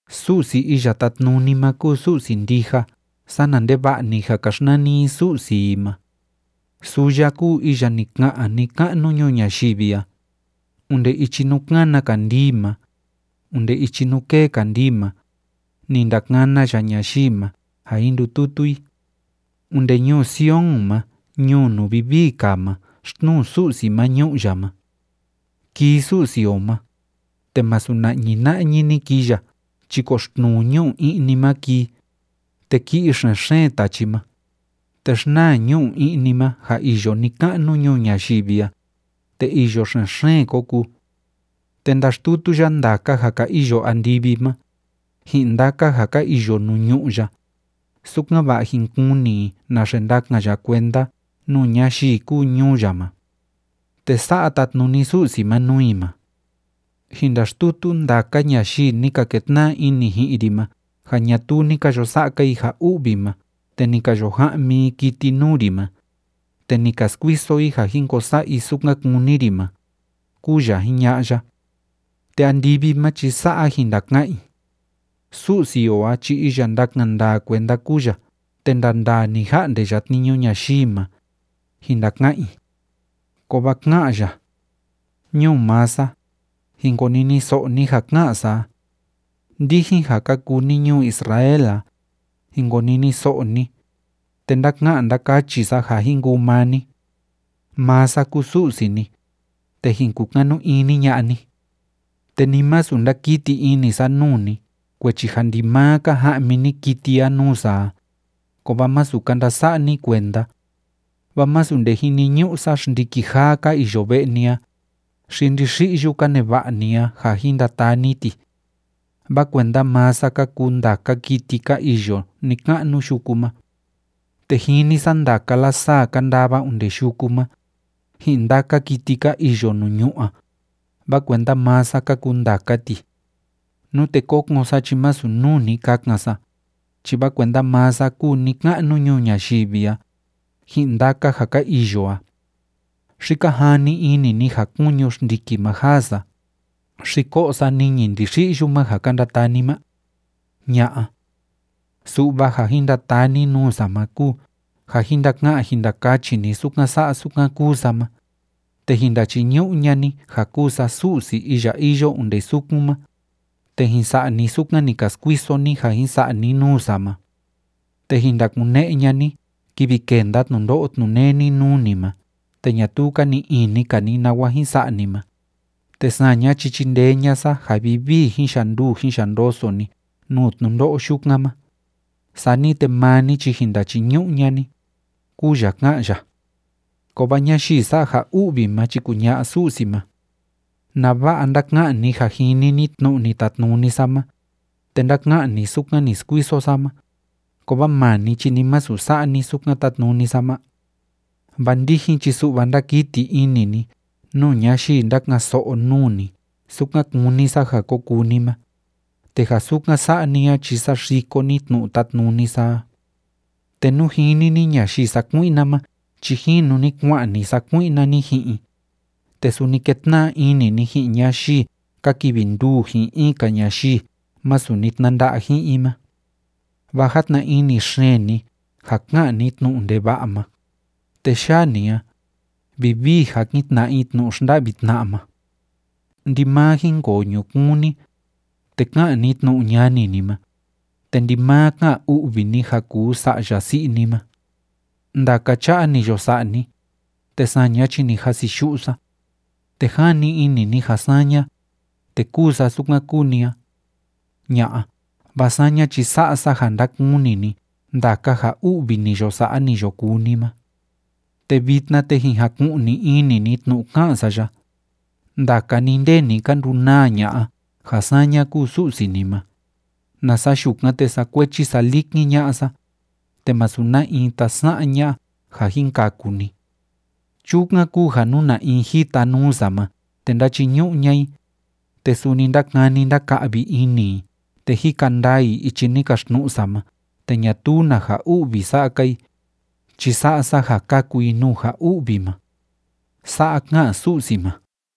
Su'si Iya Tátnuni ma kúu Su'si ndija sana ndeva'a‑ni ja ka xnani i su'si i ma. Suu ya kúu iya ni ka'an ni‑ka'nu ñuu ñayivi a. Onde ichi nuu kana kandii ma, onde ichi nuu kee kandii ma, ni ndakana ya ñayii ma ja jin ndututu i. Onde ñuu Sion ma ñuu nuu vivii kaa ma xtnuu Su'si ma ñu'u ya ma. Kii Su'si o ma, te masu na'ñi na'ñi‑ni kii ya chi koxtnuu ñu'u i'ni ma kii, te ki'i xen‑xeen tachi ma, te xnaa ñu'u i'ni ma ja iyo ni‑ka'nu ñuu ñayivi a, te îyo xen‑xeen ko kuu. Te ndaxtutu ya ndaka ja ka iyo andivi ma, ji'in ndaka ja ka iyo nuu ñu'ú ya, sukan‑va'a jin kuni i naxe ndakan ya kuenda nuu ñayii kúu ñuu ya ma. Te sa'a tatnuni Su'si ma nuu i ma: “Jin ndaxtutu ndaka ñayii ni ka ketna'a ini ji'in ri ma ja ñatuu ni ka yo sa'a‑ka i ja u'vi ma te ni ka yo ja'mi i kiti nuu ri ma, te ni ka skuiso i ja jin ko sa'a i sukan kúni ri ma”, kúu ya jiña'a ya. Te andivi ma chi sa'a jin ndaka'an i: “Su'si o a chi iya ndákan ndaa kuenda kúu ya te ndandaa‑ni ja'nde ya tniñu ñayii ma”, jin ndaka'an i. Kovaa ká'an ya: “Ñuu maa sa, jin koniniso'o ni ja ká'an sa a. Ndijin ja ka kuu ni ñuu Israel a, jin koniniso'o ni, te ndáka'an ndákachi sa ja jin kuu maa ni. Maa sa kúu Su'si ni, te jin kukanu ini ña'a ni. Te ni masu ndakiti ini sa nuu ni kuechi ja ndimaa ka ja'mi ni kiti a nuu sa a, kovaa masu ka ndasa'a ni kuenda. Vaa masu nde jiniñu'u sa xndiki jaa ka iyo ve'e ni a, xi ndixi'yu ka neva'a ni a ja jin ndataa ni ti. Vaa kuenda maa sa ka kuu ndaka kiti ka iyo ni‑ka'nu yuku ma. Te jini sa ndaka lasaa ka ndava onde yuku ma, ji'in ndaka kiti ka iyo nuu ñu'ú a, vaa kuenda maa sa ka kuu ndaka ti. Nute kokon sa chi masu nuu ni kakan sa, chi vaa kuenda maa sa kúu ni‑ka'nu ñuu ñayivi a, ji'in ndaka ja ka iyo a. ¿Xi ka jani ini ni ja kuñu xndiki ma jaa sa, xi ko'o sa niñi ndixi'yu ma ja ka ndataa ni ma? Ña'a. Su'va ja jin ndataa ni nuu sa ma kúu ja jin ndaka'an jin ndakachi ni sukan sa'a sukan kúu sa ma, te jin ndachiñu'u ña'a ni ja kúu sa Su'si iya iyo onde sukun ma, te jin sa'a ni sukan ni ka skuiso ni ja jin sa'a ni nuu sa ma. Te jin ndakune'e ña'a ni kivi kénda tnundo'o tnuneni nuu ni ma te ñatuu ka ni'i ini‑ka ni nawa jin sa'a ni ma, te saña chi chindee ña'a sa ja vivii jin yanduu jin yandoso ni nuu tnundo'o yukan ma, sani te maa ni chi jin ndachiñu'u ña'a ni”, kúu ya ká'an ya. Kovaa ñayii sa'a ja u'vi ma chi kuña'a Su'si ma: “¿Nava'a ndáka'an ni ja jini ni tnu'u ni tatnuni sa ma, te ndáka'an ni sukan ni skuiso sa ma, kovaa maa ni chi ni masu sa'a ni sukan tátnuni sa ma? Vaa ndijin chi su'va ndákiti ini ni nuu ñayii ndáka'an‑so'o nuu ni sukan kúni sa ja ko kuu ni ma, te ja sukan sa'a ni a chi saxiko ni tnu'u tátnuni sa a. Te nú jini ni ñayii sakui'na ma chi jinu ni kua'an ni sakui'na ni ji'in i, te suni kétna'a ini ni ji'in ñayii ka kivi nduu ji'in in‑ka ñayii masu ni tnanda'a ji'in i ma. Vaa játna ini xeen ni ja ka'an ni tnu'u ndeva'a ma, te yaa ni a, vivii jakin tna'a i tnu'u xnda'vi tna'a ma. Ndimaa jínkoo ñukuun ni, te ká'an ni tnu'u ñani ni ma, te ndimaa ká'an u'vi ni ja kuu sa'ya si'i ni ma. Ndaka cha'a ni yo sa'a ni, te saña chi ni jasiyu'u sa. Te jani ini ni ja saña, te kúu sa sukan kúu ni a. Ña'a. Vaa saña chi sa'a sa ja ndakuni ni ndaka ja u'vi ni yo sa'a ni yo kuu ni ma. ’Te vitna, te jin jaku'ni ini ni tnu'u ká'an sa ya, ndaka ni nde ni ka ndunaa ña'a ja saña kúu Su'si ni ma, nasa yukan, te sakuechi salikin ña'a sa, te masu na in tasa'an ña'a ja jin kaku ni. Chukan kúu ja nú na in jita nuu sa ma te ndáchiñu'u ña'a i, te suni ndákani ndáka'vi ini i te jika ndaa i ichi ni kaxtnu'u sa ma te ñatuu na ja u'vi sa'a‑ka i, chi sa'a sa ja kaku i nuu ja u'vi ma.” Sa'a ká'an Su'si ma.